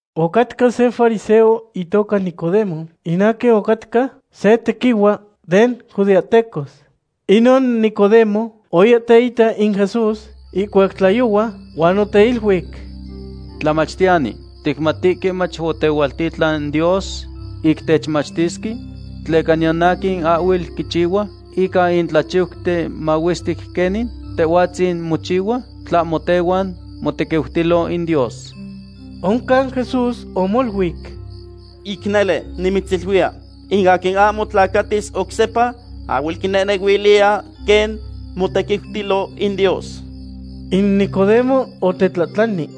Ocatca se fariseo itoca Nicodemo, in aquin ocatca se tequihua den judeahtecos. Inon Nicodemo oya teita in Jesús ihcuac tlayohua, huan oteiluic: ―Tlamachtiyani, ticmatihque mach otehualtitlan Dios ic techmachtisque, tleca niyan aquin ahhuel quichihua ica in tlachiuten mahuestic quenin Tehhuatzin mochihua tlahmo tehuan motequiutilo in Dios. Oncan Jesús omoluic: ―Ic nele, nimitziluiya, in aquin ahmo tlacatis oc sepa ahhuel quinehnehuiliya quen motequiutilo in Dios. In Nicodemo otetlahtlani: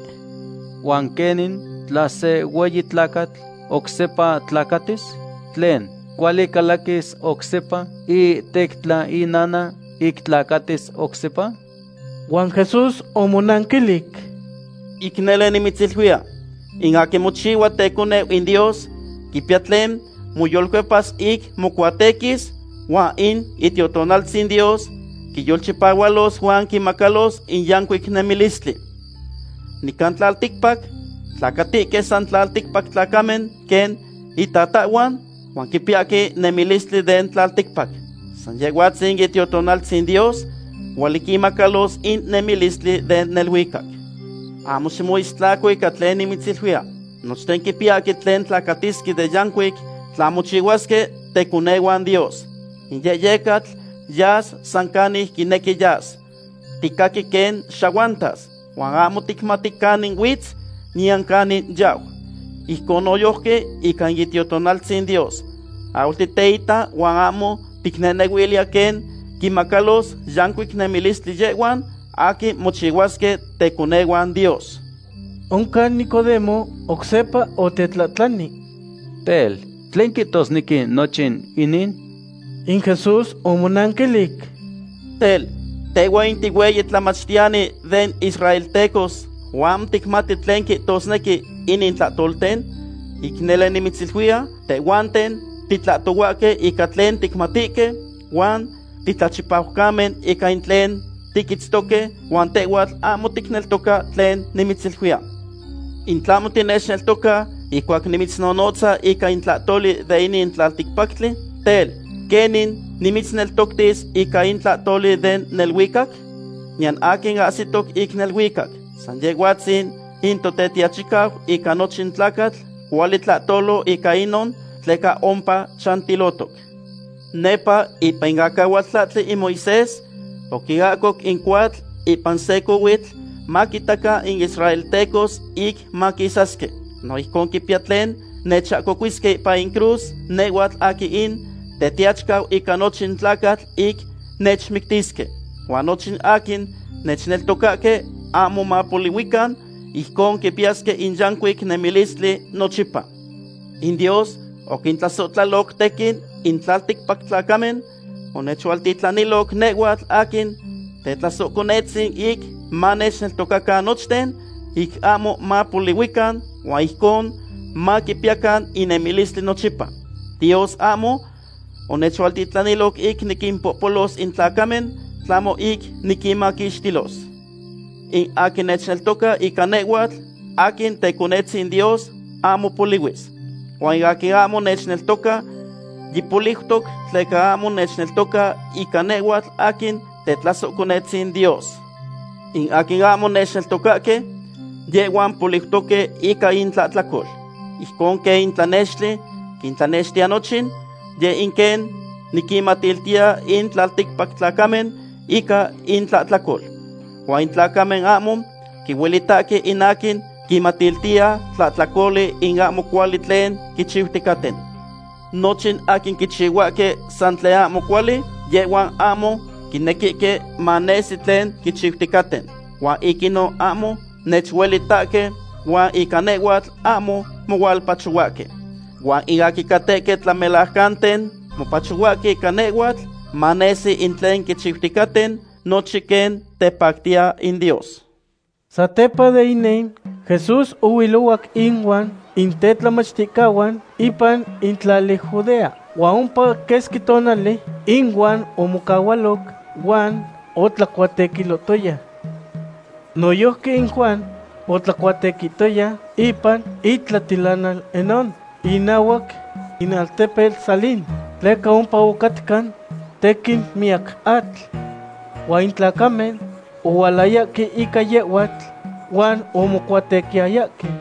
―¿Huan quenin tla se hueyi tlacatl oc sepa tlacatis? Tlen, ¿cuali calaquis oc sepa iihtectla inana, ic tlacatis oc sepa? Huan Jesús omonanquilic: ―Ic nele nimitziluiya, in aquin mochihua teconeu in Dios quipiya tlen moyolcuepas ic mocuatequis, huan in Itiotonaltzin Dios quiyolchipahualos huan quimacalos in yancuic nemilistli. Nican tlalticpac tlacatihque san tlalticpac tlacamen quen intatahhuan, huan quipiyahque nemilistli den tlalticpac. San Yehhuatzin in Itiotonaltzin Dios cuali quinmacalos in nemilistli den neluicac. Ahmo ximoistlaco ica tlen nimitziluiya: “Nochten quipiyahque tlen tlacatisque de yancuic tla mochihuasque teconehuan Dios.” In yehyecatl yas san canic quinequi yas. Ticaqui quen xahuantas, huan ahmo ticmati canin huitz, niyan canin yau. Ijcon noyojqui ica in Itiotonaltzin Dios. Ahhuel titeita huan ahmo ticnehnehuiliya quen quinmacalos yancuic nemilistli yehhuan aquin mochihuasque teconehuan Dios. Oncan Nicodemo oc sepa otetlahtlani: ―Tel, ¿tlen quihtosnequi nochin inin? In Jesús omonanquilic: ―Tel, ¿tehhhua in tihueyi tlamachtiyani den israltecos, huan ahmo ticmati tlen quihtosnequi inin tlahtolten? Ic nele nimitziluiya, tehhuanten titlahtohuahque ica tlen ticmatihque, huan titlachipaucamen ica in tlen tiquitztoque, huan tehhuatl ahmo ticneltoca tlen nimitziluiya. In tlahmo tinechneltoca ihcuac nimitznonotza ica in tlahtoli den inin tlalticpactli, tel, ¿quenin nimitzneltoctis ica in tlahtoli den neluicac? ’Niyan aquin ahsitoc in neluicac. San Yehhuatzin in Tetiachicau ica nochin tlacatl cuali tlahtolo ica inon tleca ompa chantilotoc. Nepa ipan in acahualtlahtli in Moisés oquiahcoc in cohuatl ipan se cohuitl maquitacan in israeltecos ic maquisasque. No ijcon quipiya tlen nechahcocuisque ipan in cruz nehhuatl aquin in Tetiachicau ica nochin tlacatl ic nechmictisque. Huan nochin aquin nechneltocahque ahmo mapolihuican, ijcon quipiyasque in yancuic nemilistli nochipa. ’In Dios oquintlasohtlaloc tequin in tlalticpac tlacamen, onechualtitlaniloc nehhuatl aquin Tetlasohconetzin ic manechneltocacan nochten, ic ahmo mapolihuican, huan ijcon maquipiyacan in nemilistli nochipa. Dios ahmo onechualtitlaniloc ic niquimpohpolos in tlacamen, tlahmo ic niquinmaquixtilos. ’In aquin nechneltoca ica nehhuatl aquin Teconetzin Dios ahmo polihuis, huan in aquin ahmo nechneltoca yipoliutoc tleca ahmo nechneltoca ica nehhuatl aquin Tetlasohconetzin Dios. In aquin ahmo nechneltocahque, yehhuan poliutoque ica intlahtlacol. Ijcon quen in tlanextli quintlanextiya nochin, yeh in quen niquinmatiltiya in tlalticpac tlacamen ica intlahtlacol. Huan in tlacamen ahmo quihuelitahque in aquin quinmatiltiya tlahtlacoli in ahmo cuali tlen quichiuticaten. Nochin aquin quichihuahque san tlen ahmo cuali, yehhuan ahmo quinequihque manesi tlen quichiuticaten. Huan ic inon ahmo nechuelitahque huan ica nehhuatl ahmo mohualpachohuahque. Huan in aquin catehque tlamelajcanten mopachohuahque ica nehhuatl, manesi in tlen quichiuticaten, nochin quen tepactiya in Dios. Satepa de inin, Jesús ohuilohuac inuan in tetlamachticahuan ipan in tlali Judea, huan ompa quesqui tonali inuan omocahualo huan otlacuatequilohtoya. Noyojqui in Juan otlacuatequihtoya ipan itlatilanal Enón, inahuac in altepetl Salim, tleca ompa ocatca tequin miyac atl. Huan in tlacamen ohualayahque ica yehhuatl huan omocuatequiyayahque.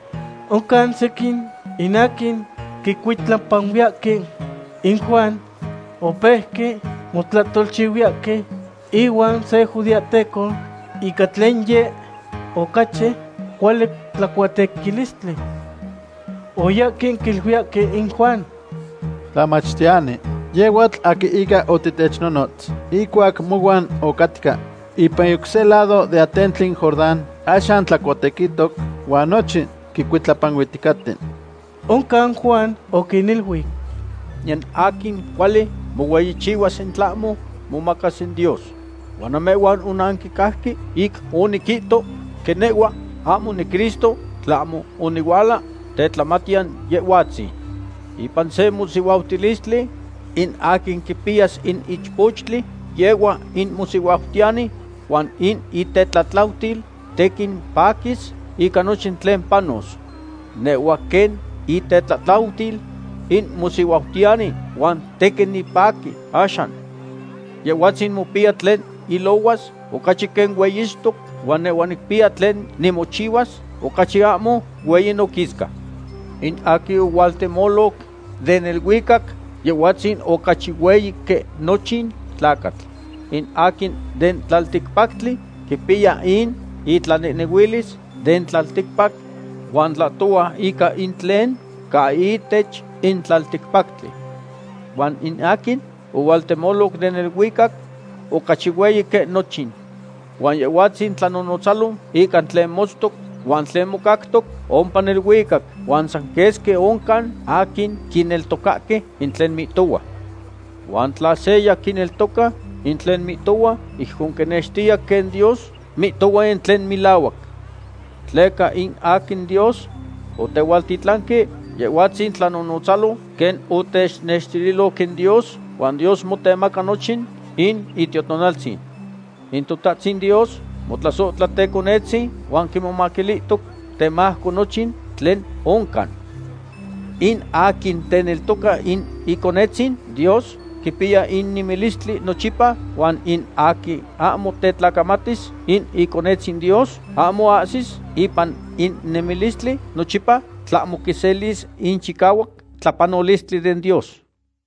Oncan sequin in aquin quicuitlapanuiyahque in Juan opeuque motlahtolchihuiyahque ihuan se judeahteco ica tlen yeh ocachi cuali tlacuatequilistli. Oyahque quiluiyahque in Juan: ―Tlamachtiyani, yehhuatl aquin ica otitechnonotz ihcuac mohuan ocatca ipan in oc se lado den atentli Jordán, axan tlacuatequihtoc huan nochin quicuitlapanuihticaten. Oncan Juan oquiniluic: ―Niyan aquin cuali mohueyichihuas in tlahmo momacas in Dios. Huan namehhuan onanquicajque ic oniquihto quen nehhua ahmo niCristo, tlahmo onihuala tetlamatiyan Yehhuatzin. Ipan se mosihuautilistli in aquin quipiyas in ichpochtli, yehhua in mosihuautiyani, huan in itetlatlautil tequin paquis ica nochin tlen panos. Nehhua quen itetlatlautil in mosihuautiyani, huan tequin nipaqui axan. Yehhuatzin mopiya tlen ilohuas ocachi quen hueyixtoc huan nehhua nicpiya tlen nimochihuas ocachi ahmo hueyi noquisca. In aquin ohualtemoloc den neluicac, Yehhuatzin ocachi hueyi quen nochin tlacatl. In aquin den tlalticpactli quipiya in itlanehnehuilis den tlalticpac, huan tlahtohua ica in tlen ca ihtech in tlalticpactli. Huan in aquin ohualtemoloc den neluicac ocachi hueyi quen nochin. Huan Yehhuatzin tlanonotzalo ica tlen motztoc huan tlen mocactoc ompa neluicac, huan san quesqui oncan aquin quineltocahque in tlen mihtohua. Huan tla seya quineltoca in tlen mihtohua, ijcon quinextiya quen Dios mihtohua in tlen melahuac. Tleca in aquin Dios otehualtitlanque, Yehhuatzin tlanonotzalo quen otenextililoc in Dios, huan Dios motemaca nochin in Itiotonaltzin. In Totahtzin Dios motlasohtla Teconetzin, huan quimomaquilihtoc temajco nochin tlen oncan. In aquin teneltoca in Iconetzin Dios quipiya in nemilistli nochipa, huan in aquin ahmo tetlacamatis in Iconetzin Dios ahmo ahsis ipan in nemilistli nochipa, tlahmo quiselis in chicahuac tlapanolistli den Dios.